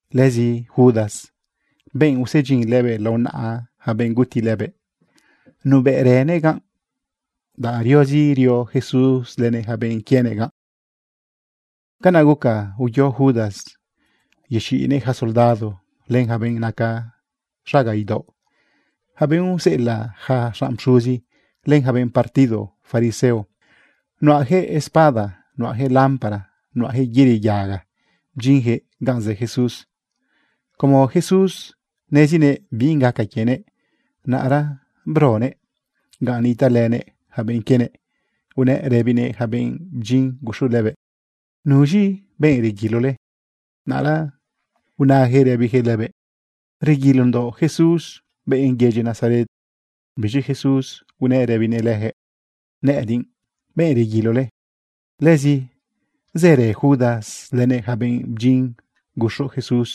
Lëzi Judas, benꞌ usedyin lëbëꞌ lao naꞌa yaca benꞌ guti lëbëꞌ, nubëꞌrënëꞌ ganꞌ, danꞌ riozi rio Jesús lënëꞌ yaca benꞌ quienëꞌ ganꞌ. Canaꞌ guca uyo Judas yexiꞌnëꞌ yaca soldado len yaca benꞌ naca xaga idaoꞌ, yaca benꞌ useꞌelaꞌ yaca xanꞌ pxuzi, len yaca benꞌ partido fariseo. Nuꞌayaquëꞌ espada, nuꞌayaquëꞌ lámpara, nuꞌayaquëꞌ yëri yaga, bdyinyaquëꞌ ganꞌ zë Jesús. Como Jesús nezinëꞌ binꞌ gaca quienëꞌ, naꞌra bronëꞌ ganꞌ nitaꞌlënëꞌ yaca benꞌ quienëꞌ, unëꞌ rëbinëꞌ yaca benꞌ bdyin guxu lëbëꞌ: ―¿Nuz̃i benꞌ reguilole? Naꞌra unayaquëꞌ rëbiyaquëꞌ lëbëꞌ: ―Reguilondoꞌ Jesús, benꞌ yedyi Nazaret. Biz̃i Jesús unëꞌ rëbinëꞌ leyaquëꞌ: ―Nëꞌëdiꞌ benꞌ reguilole. Lëzi zërë Judas lënëꞌ yaca benꞌ bdyin guxu Jesús.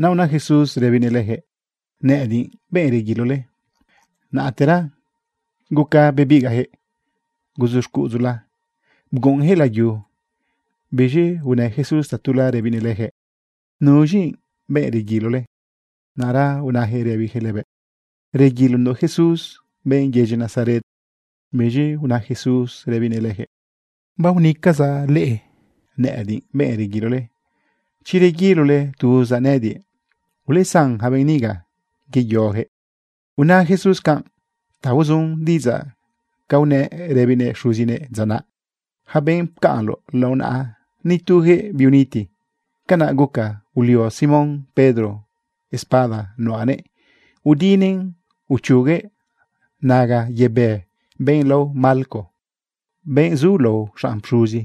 Naꞌ una Jesús rëbinëꞌ leyaquëꞌ: “Nëꞌëdiꞌ benꞌ reguilole”, naꞌtera guca bebigaꞌyaquëꞌ guzu xcuꞌudzula, bguꞌunyaquëꞌ layu. Biz̃i unë Jesús tatula rëbinëꞌ leyaquëꞌ: ―¿Nuz̃i benꞌ reguilole? Naꞌra unayaquëꞌ rëbiyaquëꞌ lëbëꞌ: ―Reguilondoꞌ Jesús, benꞌ yedyi Nazaret. Biz̃i una Jesús rëbinëꞌ leyaquëꞌ: ―Baonëcazaꞌ leꞌe nëꞌëdiꞌ benꞌ reguilole. Chi reguilole tuzaꞌ nëꞌëdiꞌ, ulesan yaca benꞌ niga yeyoyaquëꞌ. Una Jesús canꞌ ta uzun diꞌidzaꞌ ca unëꞌ rëbinëꞌ Xuzinëꞌ dza naꞌ: “Yaca benꞌ pcaꞌnloꞌ lao naꞌa, nituyaquëꞌ biuniti.” Canaꞌ guca ulio Simón Pedro espada nuꞌanëꞌ udinëꞌn uchuguëꞌ naga yebë benꞌ lao Malco, benꞌ zulao xanꞌ pxuzi.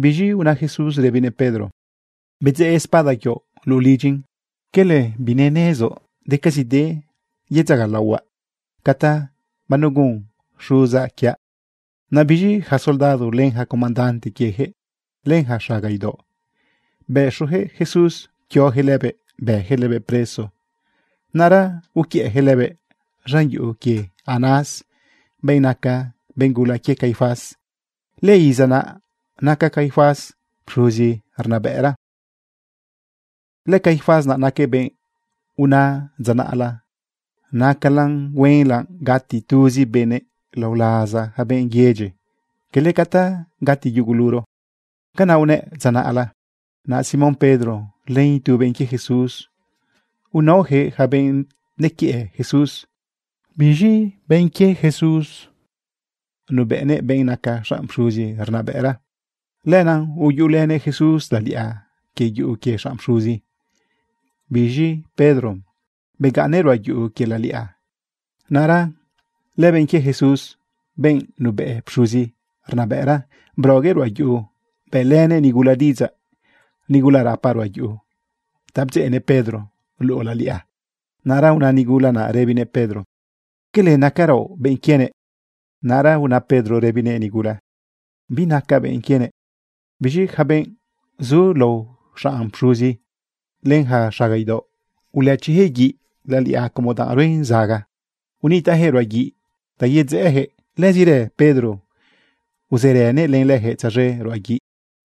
Biz̃i una Jesús rëbinëꞌ Pedro: ―Bedzeꞌ espada quioꞌ luꞌu lidyin. ¿Cala binenezoꞌ decazide yedzagalaohuaꞌ ca ta banugun Xuzaꞌ quiaꞌ? Naꞌ biz̃i yaca soldado, len comandante quieyaquëꞌ, len yaca xaga idaoꞌ, bëxuyaquëꞌ Jesús pquioyaquëꞌ lëbëꞌ bëyaquëꞌ lëbëꞌ preso. Naꞌra uquiëꞌyaquëꞌ lëbëꞌ z̃an yuꞌu quie Anás, benꞌ naca benꞌ gula quie Caifás. Lëiza naꞌ naca Caifás pxuzi rnabëꞌra. LëCaifás naquëꞌ benꞌ una dza naꞌla: “Nacalan huenla gati tuzi benëꞌ lao laza yaca benꞌ yedyi, cala ca ta gati yuguluro.” Canaꞌ unëꞌ dza naꞌla. Naꞌ Simón Pedro len itu benꞌ quie Jesús, unaoyaquëꞌ yaca benꞌ nequiëꞌ Jesús. Biz̃i lëbenꞌ quie Jesús nubëꞌnëꞌ benꞌ naca xanꞌ pxuzi rnabëꞌra, lenaꞌ uyuꞌulënëꞌ Jesús laliꞌa quie yuꞌu quie xanꞌ pxuzi. Biz̃i Pedro begaꞌnnëꞌ ruꞌa yuꞌu quie laliꞌa. Naꞌra lëbenꞌ quie Jesús, benꞌ nubëꞌ pxuzi rnabëꞌra, broguëꞌ ruꞌa yuꞌu, bëꞌlënëꞌ nigula diꞌidzaꞌ, nigula rapa ruꞌa yuꞌu, ta bdzeꞌnëꞌ Pedro luꞌu laliꞌa. Naꞌra una nigula naꞌ rëbinëꞌ Pedro: ―¿Cala nacaraoꞌ benꞌ quienëꞌ? Naꞌra una Pedro rëbinëꞌ nigula: ―Binacaꞌ benꞌ quienëꞌ. Biz̃i yaca benꞌ zulao xanꞌ pxuzi len yaca xaga idaoꞌ, ulëchiyaquëꞌ guiꞌ laliꞌa como danꞌ ruen zaga. Unitaꞌyaquëꞌ ruꞌa guiꞌ ta yedzeꞌeyaquëꞌ. Lëzirë Pedro uzërënëꞌ len leyaquëꞌ tzaz̃e ruꞌa guiꞌ.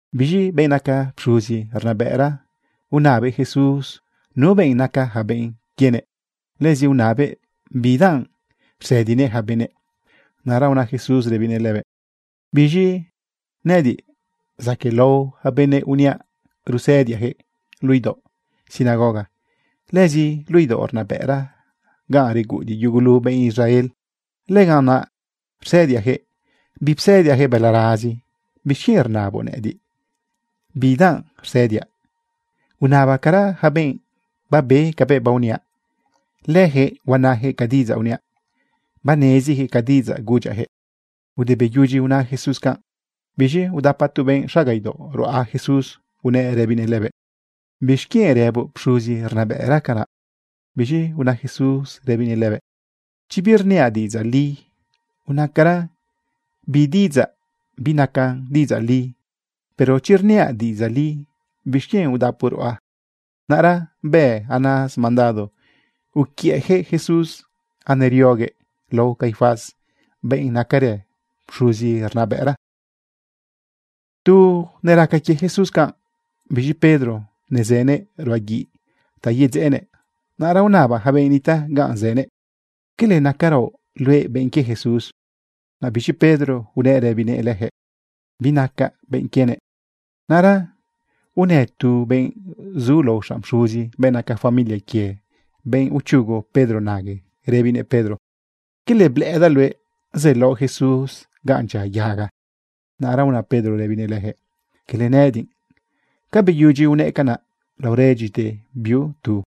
Biz̃i benꞌ naca pxuzi rnabëꞌra, unabëꞌ Jesús nu benꞌ naca yaca benꞌ quienëꞌ, lëzi unabëꞌ bidanꞌ rsëdinëꞌ yaca benëꞌ. Naꞌra una Jesús rëbinëꞌ lëbëꞌ: ―Biz̃i nëꞌëdiꞌ zaquëꞌlao yaca benëꞌ uniaꞌ rusëdiaꞌyaquëꞌ. Luꞌu idaoꞌ sinagoga, lëzi luꞌu idaoꞌ rnabëꞌra ganꞌ reguꞌudiꞌ yugulu benꞌ Israel, lëganꞌ naꞌ rsëdiaꞌyaquëꞌ. Bipsëdiaꞌyaquëꞌ balarazi. ¿Bixquienꞌ rnaboꞌ nëꞌëdiꞌ bidanꞌ rsëdiaꞌ? Unabacara yaca benꞌ babe cabëꞌ baoniaꞌ. Leyaquëꞌ huanayaquëꞌ ca diꞌidzaꞌ uniaꞌ. Baneziyaquëꞌ ca diꞌidzaꞌ gudyaꞌyaquëꞌ. Ude beyudyi una Jesús canꞌ, biz̃i udapa tu benꞌ xaga idaoꞌ ruꞌa Jesús, unëꞌ rëbinëꞌ lëbëꞌ: ―¿Bixquienꞌ rëboꞌ pxuzi rnabëꞌra canaꞌ? Biz̃i una Jesús rëbinëꞌ lëbëꞌ: ―Chi birniaꞌ diꞌidzaꞌ li, unacara bi diꞌidzaꞌ binacan diꞌidzaꞌ li. Pero chi rniaꞌ diꞌidzaꞌ li, ¿bixquienꞌ udapoꞌ ruꞌa? Naꞌra bë Anás mandado uquiëꞌyaquëꞌ Jesús anerioguëꞌ lao Caifás, benꞌ nacarë pxuzi rnabëꞌra. Tu neraca quie Jesús canꞌ, biz̃i Pedro nezënëꞌ ruꞌa guiꞌ ta yedzeꞌenëꞌ. Naꞌra unaba yaca benꞌ nitaꞌ ganꞌ zënëꞌ: ―¿Cala nacaraoꞌ luëꞌ benꞌ quie Jesús? Naꞌ biz̃i Pedro unëꞌ rëbinëꞌ leyaquëꞌ: ―Binacaꞌ benꞌ quienëꞌ. Naꞌra unë tu benꞌ zulao xanꞌ pxuzi, benꞌ naca familia quie benꞌ uchugu Pedro nague, rëbinëꞌ Pedro: ―¿Cala blëꞌëdaꞌ luëꞌ zëlaoꞌ Jesús ganꞌ dyia yaga? Naꞌra una Pedro rëbinëꞌ leyaquëꞌ: ―Cala nëꞌëdiꞌ. Ca beyudyi unëꞌ canaꞌ, laoredyite biu tu.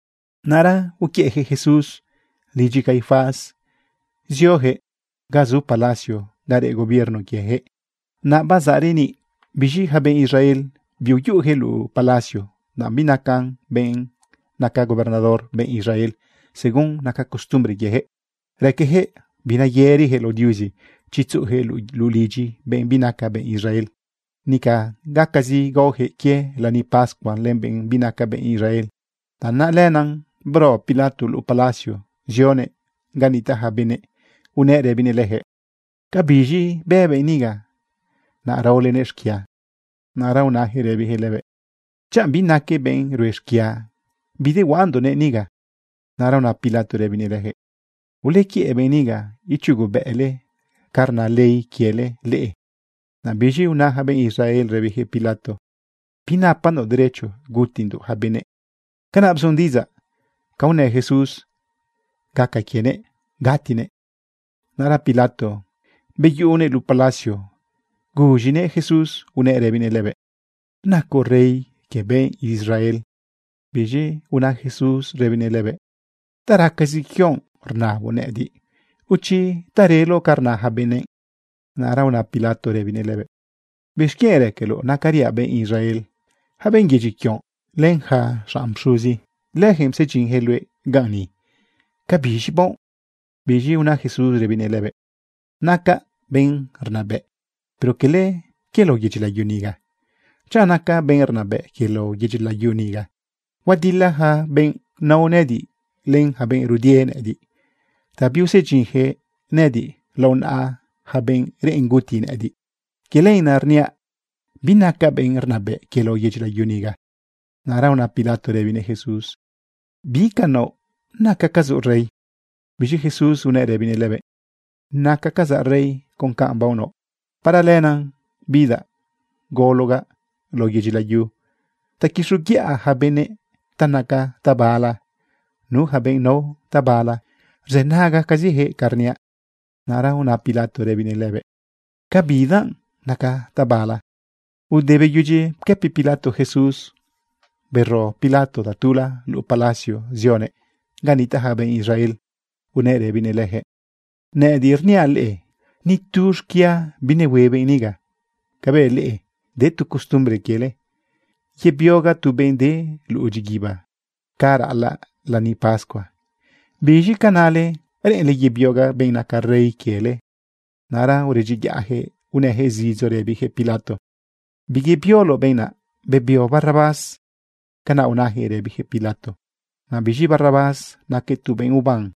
Naꞌra uquiëꞌyaquëꞌ Jesús lidyi Caifás zioyaquëꞌ ga zu palacio ga reꞌ gobierno quieyaquëꞌ, naꞌ bazaꞌ reniꞌ. Biz̃i yaca benꞌ Israel, biuyuꞌuyaquëꞌ luꞌu palacio, danꞌ binaca benꞌ naca gobernador benꞌ Israel. Según naca costumbre quieyaquëꞌ, raqueyaquëꞌ bineyëriyaquëꞌ lao Diuzi chi tzuꞌuyaquëꞌ luꞌu lidyi benꞌ binaca benꞌ Israel. Nica gacazi gaoyaquëꞌ quie lani pascua len benꞌ binaca benꞌ Israel. Tanaꞌ lenaꞌ bro Pilato luꞌu palacio, zionëꞌ ga nitaꞌ yaca benëꞌ, unëꞌ rëbinëꞌ leyaquëꞌ: ―¿Cabiz̃i bë benꞌ niga, naꞌ raolenëꞌ xquia? Naꞌra unayaquëꞌ rëbiyaquëꞌ lëbëꞌ: ―Chanꞌ binaquëꞌ benꞌ rue xquia, bidehuaꞌandoꞌnëꞌ niga. Naꞌra una Pilato rëbinëꞌ leyaquëꞌ: ―Ulequiëꞌ benꞌ niga, ichugobëꞌle ca rna ley quiele leꞌe. Naꞌ biz̃i una yaca benꞌ Israel rëbiyaquëꞌ Pilato: ―Binapandoꞌ derecho gutindoꞌ yaca benëꞌ. Canaꞌ bzun diꞌidzaꞌ ca unë Jesús gaca quienëꞌ gatinëꞌ. Naꞌra Pilato beyuꞌunëꞌ luꞌu palacio guz̃inëꞌ Jesús unëꞌ rëbinëꞌ lëbëꞌ: ―¿Nacoꞌ rey quie benꞌ Israel? Biz̃i una Jesús rëbinëꞌ lëbëꞌ: ―¿Ta racazi quioꞌ rnaboꞌ nëꞌëdiꞌ, o chi ta reloꞌ ca rna yaca benëꞌ? Naꞌra una Pilato rëbinëꞌ lëbëꞌ: ―¿Bixquienꞌ raqueloꞌ nacariaꞌ benꞌ Israel? Yaca benꞌ yedyi quioꞌ, len yaca xanꞌ pxuzi, leyaquëꞌ psedyinyaquëꞌ luëꞌ ganꞌ ni. ¿Cabiz̃i baoꞌ? Biz̃i una Jesús rëbinëꞌ lëbëꞌ: ―Nacaꞌ benꞌ rnabëꞌ, pero cala quie lao yedyi layu niga. Chanꞌ nacaꞌ benꞌ rnabëꞌ quie lao yedyi layu niga, huadila yaca benꞌ nao nëꞌëdiꞌ len yaca benꞌ rudie nëꞌëdiꞌ ta biusedyinyaquëꞌ nëꞌëdiꞌ lao naꞌa yaca benꞌ reꞌen guti nëꞌëdiꞌ. Quie lenaꞌ rniaꞌ binacaꞌ benꞌ rnabëꞌ quie lao yedyi layu niga. Naꞌra una Pilato rëbinëꞌ Jesús: ―¿Bi ca naoꞌ? ¿Nacacazoꞌ rey? Biz̃i Jesús unëꞌ rëbinëꞌ lëbëꞌ: ―Nacacazaꞌ rey con canꞌ baonaoꞌ. Para lenaꞌ bidaꞌ gologaꞌ lao yedyi layu ta quixoguiꞌa yaca benëꞌ ta naca tabala. Nu yaca benꞌ nao tabala rzënagacaziyaquëꞌ ca rniaꞌ. Naꞌra una Pilato rëbinëꞌ lëbëꞌ: ―¿Ca bidanꞌ naca tabala? Ude beyudyi pquëpi Pilato Jesús, bero Pilato tatula luꞌu palacio zionëꞌ ga nitaꞌ yaca benꞌ Israel unëꞌ rëbinëꞌ leyaquëꞌ: ―Nëꞌëdiꞌ rniaꞌ leꞌe, nitu xquia binehue benꞌ niga. Cabëꞌ leꞌe, de tu costumbre quiele yebiogaꞌ tu benꞌ de luꞌu dyiguiba ca raꞌalaꞌ lani pascua. ¿Biz̃i ca nale? ¿Reꞌenle yebiogaꞌ benꞌ naca rey quiele? Naꞌra uredyiyaꞌyaquëꞌ unëyaquëꞌ zidzo rëbiyaquëꞌ Pilato: ―Biyebioloꞌ benꞌ naꞌ. Bebio Barrabás. Canaꞌ unayaquëꞌ rëbiyaquëꞌ Pilato. Naꞌ biz̃i Barrabás naquëꞌ tu benꞌ uban.